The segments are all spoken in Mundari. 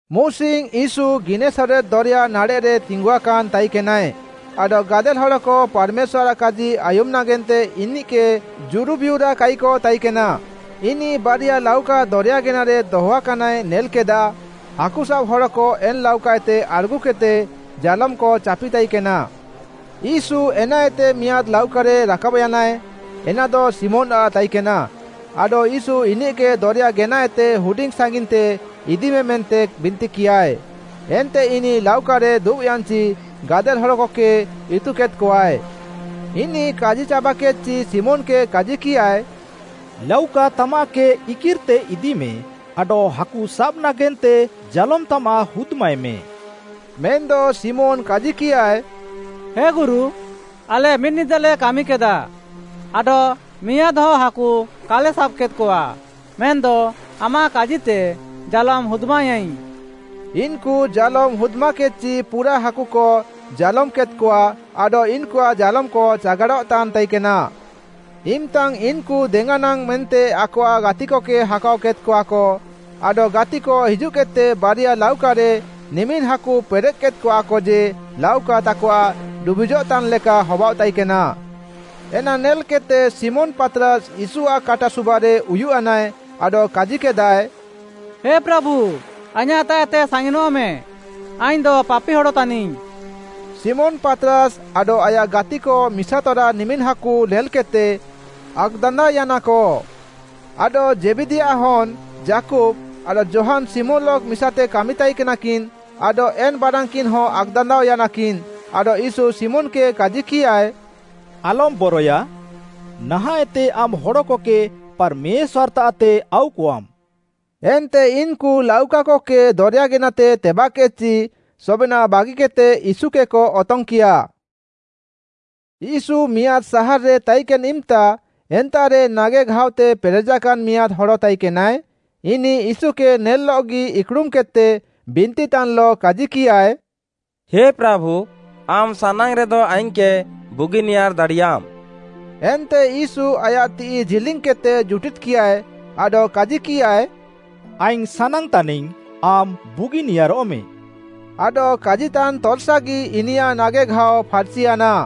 ମୁସିଙ୍ଗ୍‌ ୟୀଶୁ ଗିନେସରେତ୍‌ ଦରେୟା ନାଡ଼େଃରେ ତିଙ୍ଗୁଆକାନ୍‌ ତାଇକେନାଏ, ଆଡଃ ଗାଦେଲ୍‌ ହଡ଼କ ପାର୍‌ମେଶ୍ୱାର୍‌ଆଃ କାଜି ଆୟୁମ୍‌ ନାଗେନ୍ତେ ଇନିଃକେ ଜୁରୁବିୟୁରାକାଇକ ତାଇକେନା, ଇନିଃ ବାରିଆ ଲାଉକା ଦରେୟା ଗେନାରେ ଦହଆକାନାଏ ନେଲ୍‌କେଦାଃ, ହାକୁସାବ୍‌ ହଡ଼କ ଏନ୍‌ ଲାଉକାଏତେ ଆଡ଼୍‌ଗୁକେଦ୍‌ତେ ଜାଲୋମ୍‌କ ଚାପିତାଇକେନା। ୟୀଶୁ ଏନାଏତେ ମିଆଁଦ୍‌ ଲାଉକାରେ ରାକାବ୍‌ୟାନାଏ, ଏନାଦ ଶିମୋନ୍‌ଆଃ ତାଇକେନା ଆଡଃ ୟୀଶୁ ଇନିଃକେ ଦରେୟା ଗେନାଏତେ ହୁଡିଙ୍ଗ୍‌ ସାଙ୍ଗିନ୍‌ତେ ଇଦିମେ ମେନ୍ତେ ବିନ୍ତିକିୟାଏ। ଏନ୍ତେ ଇନିଃ ଲାଉକାରେ ଦୁବ୍‌ୟାନ୍‌ଚି ଗାଦେଲ୍‌ ହଡ଼କକେ ଇତୁକେଦ୍‌କଆଏ। ଇନିଃ କାଜିଚାବାକେଦ୍‌ଚି ଶିମୋନ୍‌କେ କାଜିକିୟାଏ, “ଲାଉକା ତାମାଃକେ ଇକିର୍‌ତେ ଇଦିମେ ଆଡଃ ହାକୁସାବ୍‌ ନାଗେନ୍ତେ ଜାଲୋମ୍‌ ତାମାଃ ହୁଦ୍‌ମାଏମେ।” ମେନ୍‌ଦ ଶିମୋନ୍‌ କାଜିକିୟାଏ, “ହେ ଗୁରୁ, ଆଲେ ମିଦ୍‌ନିଦାଲେ କାମିକେଦା ଆଡଃ ମିଆଁଦ୍‌ହ ହାକୁ କାଲେ ସାବ୍‌କେଦ୍‌କଆ। ମେନ୍‌ଦ ଆମାଃ କାଜିତେ ଜାଲୋମ୍‌ ହୁଦ୍‌ମାୟାଇଙ୍ଗ୍‌।” ଇନ୍‌କୁ ଜାଲୋମ୍ ହୁଦ୍‌ମାକେଦ୍‌ଚି ପୁରାଃ ହାକୁକ ଜାଲୋମ୍‌କେଦ୍‌କଆ, ଆଡଃ ଇନ୍‌କୁଆଃ ଜାଲୋମ୍‌କ ଚାଗାଡ଼ଃତାନ୍ ତାଇକେନା। ଇମ୍‌ତାଙ୍ଗ୍‌ ଇନ୍‌କୁ ଦେଙ୍ଗାନାଙ୍ଗ୍‌ ମେନ୍ତେ ଆକଆଃ ଗାତିକକେ ହାକାଅ କେଦ୍‌କଆକ। ଆଡଃ ଗାତିକ ହିଜୁଃକେଦ୍‌ତେ ବାରିଆ ଲାଉକାରେ ନିମିନ୍‌ ହାକୁ ପେରେଃକେଦ୍‌କଆକ ଯେ ଲାଉକା ତାକଆଃ ଡୁବିଜଃତାନ୍‌ଲେକା ହବାଅଃ ତାଇକେନା। ଏନା ନେଲ୍‌କେଦ୍‌ତେ ଶିମୋନ୍‌ ପାତ୍‌ରାସ୍‌ ୟୀଶୁଆଃ କାଟା ସୁବାରେ ଉୟୁଃୟାନାଏ ଆଡଃ କାଜିକେଦାଏ, “ହେ ପ୍ରାଭୁ ଆଇଁୟାଃତାଃଏତେ ସାଙ୍ଗିନଃମେଁ, ଆଇଙ୍ଗ୍‌ଦ ପାପି ହଡ଼ ତାନିଙ୍ଗ୍‌।” ଶିମୋନ୍‌ ପାତ୍‌ରାସ୍‌ ଆଡଃ ଆୟାଃ ଗାତିକ ମିସାତରା ନିମିନ୍‌ ହାକୁ ନେଲ୍‌କେଦ୍‌ତେ ଆକ୍‌ଦାନ୍ଦାଅୟାନାକ। ଆଡଃ ଜେବଦୀୟାଃ ହନ୍‌ ଯାକୁବ୍‌ ଆଡଃ ଯୋହାନ୍‌ ଶିମୋନ୍‌ଲଃ ମିସାତେ କାମି ତାଇକେନାକିନ୍‌ ଆଡଃ ଏନ୍‌ ବାରାନ୍‌କିନ୍‌ହ ଆକ୍‌ଦାନ୍ଦାଅ ୟାନାକିନ୍। ଆଡଃ ୟୀଶୁ ଶିମୋନ୍‌କେ କାଜିକିୟାଏ, “ଆଲମ୍‌ ବରଏୟା, ନାହାଁଃଏତେ ଆମ୍‌ ହଡ଼କକେ ପାର୍‌ମେଶ୍ୱାର୍‌ତାଃତେ ଆଉକଆମ୍‌।” ଏନ୍ତେ ଇନ୍‌କୁ ଲାଉକାକକେ ଦରେୟା ଗେନାତେ ତେବାଃକେଦ୍‌ଚି ସବେନାଃ ବାଗିକେଦ୍‌ତେ ୟୀଶୁକେକ ଅତଙ୍ଗ୍‌କିୟା। ୟୀଶୁ ମିଆଁଦ୍‌ ସାହାର୍‌ରେ ତାଇକେନ୍‌ ଇମ୍‌ତା ଏନ୍ତାଃରେ ନାଗେଘାଅତେ ପେରେଜାକାନ୍‌ ମିଆଁଦ୍‌ ହଡ଼ ତାଇକେନାଏ। ଇନିଃ ୟୀଶୁକେ ନେଲ୍‌ଲଃଗି ଇକ୍‌ଡ଼ୁମ୍‌କେଦ୍‌ତେ ବିନ୍ତିତାନ୍‌ଲଃ କାଜିକିୟାଏ, “ହେ ପ୍ରାଭୁ, ଆମ୍‌ ସାନାଙ୍ଗ୍‌ରେଦ ଆଇଙ୍ଗ୍‌କେ ବୁଗିନିୟାର୍‌ ଦାଡ଼ିୟାମ୍‌।” ଏନ୍ତେ ୟୀଶୁ ଆୟାଃ ତିଃଇ ଜିଲିଙ୍ଗ୍‌କେଦ୍‌ତେ ଜୁଟିଦ୍‌କିୟାଏ ଆଡଃ କାଜିକିୟାଏ, “ଆଇଙ୍ଗ୍‌ ସାନାଙ୍ଗ୍‌ତାନିଙ୍ଗ୍‌ ଆମ୍‌ ବୁଗିନିୟାରଃମେ।” ଆଡଃ କାଜିତାନ୍ ତର୍‌ସାଗି ଇନିୟାଃ ନାଗେଘାଅ ଫାର୍‌ଚିୟାନା।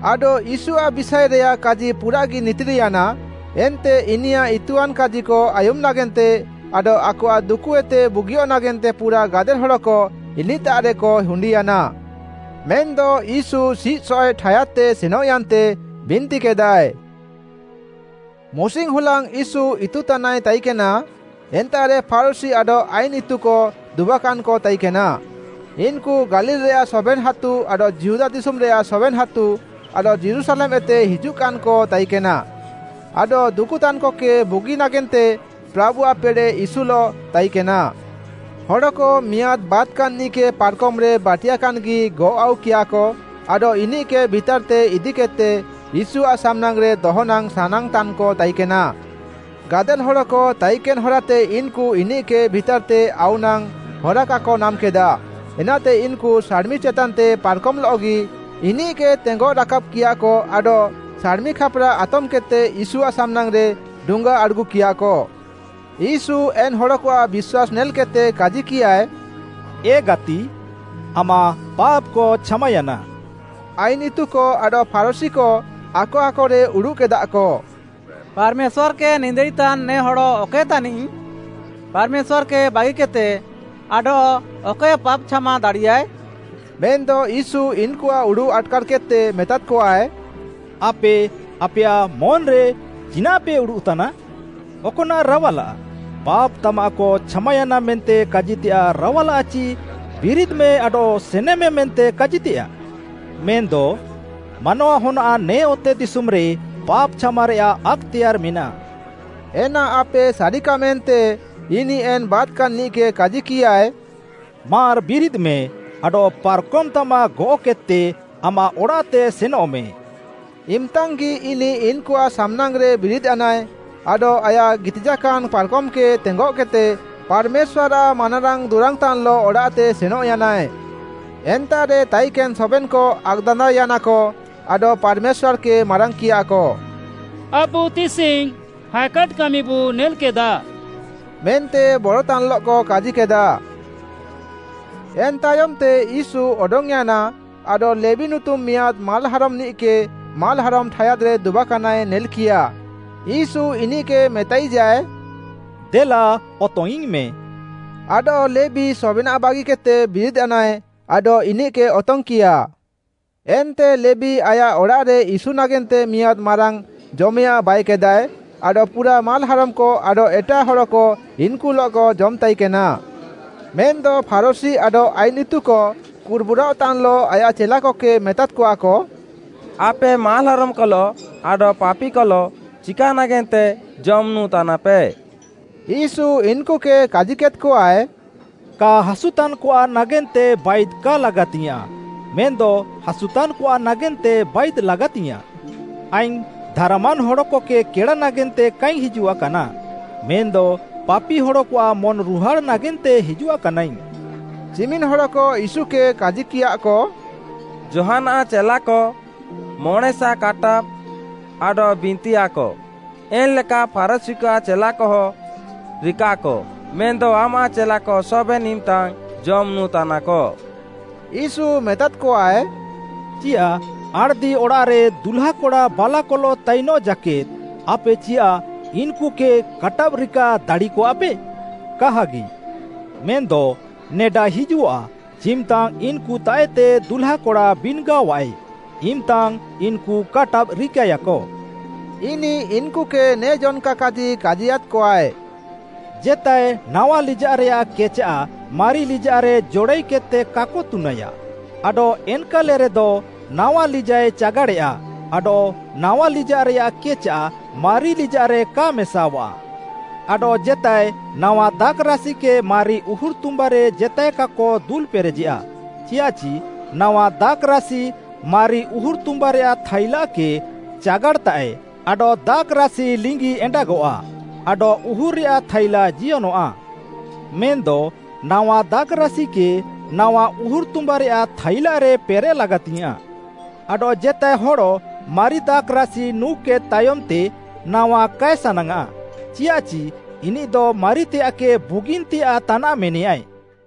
ଆଡଃ ୟୀଶୁଆଃ ବିଷାଏରେୟାଃ କାଜି ପୁରାଃଗି ନିତିର୍‌ୟାନା, ଏନ୍ତେ ଇନିୟାଃ ଇତୁଆନ୍‌ କାଜିକ ଆୟୁମ୍‌ ନାଗେନ୍ତେ ଆଡଃ ଆକଆଃ ଦୁକୁଏତେ ବୁଗିୟଃ ନାଗେନ୍ତେ ପୁରାଃ ଗାଦେଲ୍‌ ହଡ଼କ ଇନିଃତାଃରେକ ହୁଣ୍ଡିୟାନା। ମେନ୍‌ଦ ୟୀଶୁ ସିଃସଏଃ ଠାୟାଦ୍‌ତେ ସେନଃୟାନ୍ତେ ବିନ୍ତିକେଦାଏ। ମୁସିଙ୍ଗ୍‌ହୁଲାଙ୍ଗ୍‌ ୟୀଶୁ ଇତୁତାନାଏ ତାଇକେନା, ଏନ୍ତାଃରେ ଫାରୁଶୀ ଆଡଃ ଆଇନ୍‌ ଇତୁକ ଦୁବାକାନ୍‌କ ତାଇକେନା, ଇନ୍‌କୁ ଗାଲିଲ୍‌ରେୟାଃ ସବେନ୍‌ ହାତୁ ଆଡଃ ଯିହୁଦା ଦିଶୁମ୍‌ରେୟାଃ ସବେନ୍‌ ହାତୁ ଆଡଃ ଯୀରୁଶାଲେମ୍‌ଏତେ ହିଜୁଃକାନ୍‌କ ତାଇକେନା। ଆଡଃ ଦୁକୁତାନ୍‌କକେ ବୁଗିନ୍‌ ନାଗେନ୍ତେ ପ୍ରାଭୁଆଃ ପେଡ଼େଃ ୟୀଶୁଲଃ ତାଇକେନା। ହଡ଼କ ମିଆଁଦ୍‌ ବାତ୍‌କାନ୍‌ନିଃକେ ପାର୍‌କମ୍‌ରେ ବାଟିୟାକାନ୍‌ଗି ଗଅଃ ଆଉକିୟାକ ଆଡଃ ଇନିଃକେ ଭିତାର୍‌ତେ ଇଦିକେଦ୍‌ତେ ୟୀଶୁଆଃ ସାମ୍‌ନାଙ୍ଗ୍‌ରେ ଦହନାଙ୍ଗ୍‌ ସାନାଙ୍ଗ୍‌ତାନ୍‌କ ତାଇକେନା। ଗାଦେଲ୍‌ ହଡ଼କ ତାଇକେନ୍‌ ହରାତେ ଇନ୍‌କୁ ଇନିଃକେ ଭିତାର୍‌ତେ ଆଉ ନାଙ୍ଗ୍‌ ହରା କାକ ନାମ୍‌କେଦା। ଏନାତେ ଇନ୍‌କୁ ସାଡ଼୍‌ମି ଚେତାନ୍‌ତେ ପାର୍‌କମ୍‌ଲଃଗି ଇନିଃକେ ତେଙ୍ଗଃ ରାକାବ୍‌କିୟାଃକ ଆଡଃ ସାଡ଼୍‌ମି ଖାପ୍‌ରା ଆତମ୍‌କେଦ୍‌ତେ ୟୀଶୁଆଃ ସାମ୍‌ନାଙ୍ଗ୍‌ରେ ଡୁଙ୍ଗା ଆଡ଼୍‌ଗୁକିୟାଃକ। ୟୀଶୁ ଏନ୍‌ ହଡ଼କଆଃ ବିଶ୍ୱାସ୍‌ ନେଲ୍‌କେଦ୍‌ତେ କାଜିକିୟାଏ, “ଏ ଗାତି, ଆମାଃ ପାପ୍‌କ ଛାମାୟାନା।” ଆଇନ୍‌ ଇତୁକ ଆଡଃ ଫାରୁଶୀକ ଆକ ଆକରେ ଉଡ଼ୁଃକେଦାଃକ, “ପାର୍‌ମେଶ୍ୱାର୍‌କେ ନିନ୍ଦାଇତାନ୍‌ ନେ ହଡ଼ ଅକଏ ତାନିଃ? ପାର୍‌ମେଶ୍ୱାର୍‌କେ ବାଗିକେଦ୍‌ତେ ଆଡଃ ଅକଏ ପାପ୍‌ଛାମା ଦାଡ଼ିୟାଏ?” ମେନ୍‌ଦ ୟୀଶୁ ଇନ୍‌କୁଆଃ ଉଡ଼ୁଃ ଆଟ୍‌କାର୍‌କେଦ୍‌ତେ ମେତାଦ୍‌କଆଏ, “ଆପେ ଆପେୟାଃ ମନ୍‌ରେ ଚିନାଃପେ ଉଡ଼ୁଃତାନା? ଅକ୍‌ନାଃ ରାୱାଲାଃ? ‘ପାପ୍‌ ତାମାଃକ ଛାମାୟାନା’ ମେନ୍ତେ କାଜିତେୟାଃ ରାୱାଲାଃ ଚି ‘ବିରିଦ୍‌ମେ ଆଡଃ ସେନେମେ’ ମେନ୍ତେ କାଜିତେୟାଃ? ମେନ୍‌ଦ ମାନୱାହନ୍‌ଆଃ ନେ ଅତେଦିଶୁମ୍‌ରେ ପାପ୍‌ ଛାମାରେୟାଃ ଆକ୍‌ତେୟାର୍‌ ମେନାଃ” ଏନା ଆପେ ସାରିକାମେନ୍ତେ, ଇନିଃ ଏନ୍‌ ବାତ୍‌କାନ୍‌ନିଃକେ କାଜିକିୟାଏ, “ମାର୍‌ ବିରିଦ୍‌ମେ ଆଡଃ ପାର୍‌କମ୍‌ତାମାଃ ଗଅଃକେଦ୍‌ତେ ଆମାଃ ଅଡ଼ାଃତେ ସେନଃମେ।” ଇମ୍‌ତାଙ୍ଗ୍‌ଗି ଇନିଃ ଇନ୍‌କୁଆଃ ସାମ୍‌ନାଙ୍ଗ୍‌ରେ ବିରିଦ୍‌ୟାନାଏ, ଆଡଃ ଆୟାଃ ଗିତିଜାକାନ୍‌ ପାର୍‌କମ୍‌କେ ତେଙ୍ଗଃକେଦ୍‌ତେ ପାର୍‌ମେଶ୍ୱାର୍‌ଆଃ ମାନାରାଙ୍ଗ୍‌ ଦୁରାଙ୍ଗ୍‌ତାନ୍‌ଲଃ ଅଡ଼ାଃତେ ସେନଃୟାନାଏ। ଏନ୍ତାଃରେ ତାଇକାନ୍‌ ସବେନ୍‌କ ଆକ୍‌ଦାନ୍ଦାଅୟାନକ ଆଡଃ ପାର୍‌ମେଶ୍ୱାର୍‌କେ ମାରାଙ୍ଗ୍‌କିୟାକ, “ଆବୁ ତିସିଙ୍ଗ୍‌ ହାଏକାଟ୍‌ କାମିବୁ ନେଲ୍‌କେଦା” ମେନ୍ତେ ବରତାନ୍‌ଲଃକ କାଜିକେଦା। ଏନ୍‌ ତାୟମ୍‌ତେ ୟୀଶୁ ଅଡଙ୍ଗ୍‌ୟାନା, ଆଡଃ ଲେବୀ ନୁତୁମ୍‌ ମିଆଁଦ୍‌ ମାଲ୍‌ହାରମ୍‌ନିଃକେ ମାଲ୍‌ହାରମ୍‌ ଠାୟାଦ୍‌ରେ ଦୁବାକାନାଏ ନେଲ୍‌କିୟା। ୟୀଶୁ ଇନିଃକେ ମେତାଇଜାଏ, “ଦେଲା ଅତଙ୍ଗ୍‌ଇଙ୍ଗ୍‌ମେ।” ଆଡଃ ଲେବୀ ସବେନାଃ ବାଗିକେଦ୍‌ତେ ବିରିଦ୍‌ୟାନାଏ ଆଡଃ ଇନିଃକେ ଅତଙ୍ଗ୍‌କିୟା। ଏନ୍ତେ ଲେବୀ ଆୟାଃ ଅଡ଼ାଃରେ ୟୀଶୁ ନାଗେନ୍ତେ ମିଆଁଦ୍‌ ମାରାଙ୍ଗ୍‌ ଜମେୟାଃଁ ବାଇକେଦାଏ, ଆଡଃ ପୁରାଃ ମାଲ୍‌ହାରମ୍‌କ ଆଡଃ ଏଟାଃ ହଡ଼କ ଇନ୍‌କୁଲଃକ ଜମ୍‌ତାଇକେନା। ମେନ୍‌ଦ ଫାରୁଶୀ ଆଡଃ ଆଇନ୍‌ ଇତୁକ କୁର୍‌ବୁରାଅଃତାନ୍‌ଲଃ ଆୟାଃ ଚେଲାକକେ ମେତାଦ୍‌କଆକ, “ଆପେ ମାଲ୍‌ହାରମ୍‌କଲଃ ଆଡଃ ପାପିକଲଃ ଚିକା ନାଗେନ୍ତେ ଜମ୍, ନୁଁ ତାନାପେ?” ୟୀଶୁ ଇନ୍‌କୁକେ କାଜିକେଦ୍‌କଆଏ, “କା ହାସୁତାନ୍‌କଆଃ ନାଗେନ୍ତେ ବାଇଦ୍ କା ଲାଗାତିଙ୍ଗ୍‌ୟାଁଃ ମେନ୍‌ଦ ହାସୁତାନ୍‌କଆଃ ନାଗେନ୍ତେ ବାଇଦ୍‌ ଲାଗାତିଙ୍ଗ୍‌ୟାଁଃ। ଆଇଙ୍ଗ୍‌ ଧାର୍‌ମାନ୍ ହଡ଼କକେ କେଡ଼ା ନାଗେନ୍ତେ କାଇଙ୍ଗ୍‌ ହିଜୁଆକାନା, ମେନ୍‌ଦ ପାପି ହଡ଼କଆଃ ମନ୍‌ରୁହାଡ଼ଃ ନାଗେନ୍ତେ ହିଜୁଆକାନାଇଙ୍ଗ୍‌।” ଚିମିନ୍‌ ହଡ଼କ ୟୀଶୁକେ କାଜିକିୟାଃକ, “ଯୋହାନ୍‌ଆଃ ଚେଲାକ ମଣେଁସା କାଟାବ୍‌ ଆଡଃ ବିନ୍ତିୟାଃକ, ଏନ୍‌ଲେକା ଫାରୁଶୀକଆଃ ଚେଲାକହ ରିକାଃକ, ମେନ୍‌ଦ ଆମାଃ ଚେଲାକ ସବେନ୍‌ ଇମ୍‌ତାଙ୍ଗ୍‌ ଜମ୍ ନୁଁ ତାନାକ।” ୟୀଶୁ ମେତାଦ୍‌କଆଏ, “ଚିୟାଃ ଆଣ୍‌ଦିଅଡ଼ାଃରେ ଦୁହ୍ଲାକଡ଼ା ବାଲାକଲଃ ତାଇନଃ ଜାକେଦ୍‌ ଆପେ ଚିୟାଃ ଇନ୍‌କୁକେ କାଟାବ୍‌ରିକା ଦାଡ଼ିୟାକଆପେ? କାହାଗି! ମେନ୍‌ଦ ନେଡା ହିଜୁଃଆ ଚିମ୍‌ତାଙ୍ଗ୍‌ ଇନ୍‌କୁତାଃଏତେ ଦୁହ୍ଲାକଡ଼ା ବିନ୍‌ଗାଅଃଆଏ, ଇମ୍‌ତାଙ୍ଗ୍‌ ଇନ୍‌କୁ କାଟାବ୍‌ ରିକାଏୟାକ।” ଇନିଃ ଇନ୍‌କୁକେ ନେ ଜନ୍‌କା କାଜି କାଜିୟାଦ୍‌କଆଏ, “ଜେତାଏ ନାୱା ଲିଜାଃରେୟାଃ କେଚାଃ ମାରି ଲିଜାଃରେ ଜଡ଼ାଇକେଦ୍‌ତେ କାକ ତୁନାୟା। ଆଡଃ ଏନ୍‌କାଲେରେଦ ନାୱା ଲିଜାଃଏ ଚାଗାଡ଼େୟା ଆଡଃ ନାୱା ଲିଜାଃରେୟାଃ କେଚାଃ ମାରିଲିଜାଃରେ କା ମେସାଅଃଆ। ଆଡଃ ଜେତାଏ ନାୱା ଦାଖ୍‌ରାସିକେ ମାରି ଉହୁର୍‌ତୁମ୍ବାରେ ଜେତାଏ କାକ ଦୁଲ୍‌ପେରେଜେୟା। ଚିୟାଃଚି ନାୱା ଦାଖ୍‌ରାସି ମାରି ଉହୁର୍‌ତୁମ୍ବାରେୟାଃ ଥାଇଲାକେ ଚାଗାଡ଼୍‌ତାଃଏ ଆଡଃ ଦାଖ୍‌ରାସି ଲିଙ୍ଗି ଏଣ୍ଡାଗଃଆ ଆଡଃ ଉହୁର୍‌ରେୟାଃ ଥାଇଲା ଜିୟନଃଆ। ମେନ୍‌ଦ ନାୱା ଦାଖ୍‌ରାସିକେ ନାୱା ଉହୁର୍‌ତୁମ୍ବାରେୟାଃ ଥାଇଲାରେ ପେରେଃ ଲାଗାତିଙ୍ଗ୍‌ୟାଁଃ। ଆଡଃ ଜେତାଏ ହଡ଼ ମାରି ଦାଖ୍‌ରାସି ନୁଁକେଦ୍ ତାୟମ୍‌ତେ ନାୱା କାଏ ସାନାଙ୍ଗ୍‌ଆଃ, ଚିୟାଃଚି ଇନିଃଦ ‘ମାରିତେୟାଃକେ ବୁଗିନ୍‌ତେୟାଃ ତାନାଃ’ ମେନେୟାଏ।”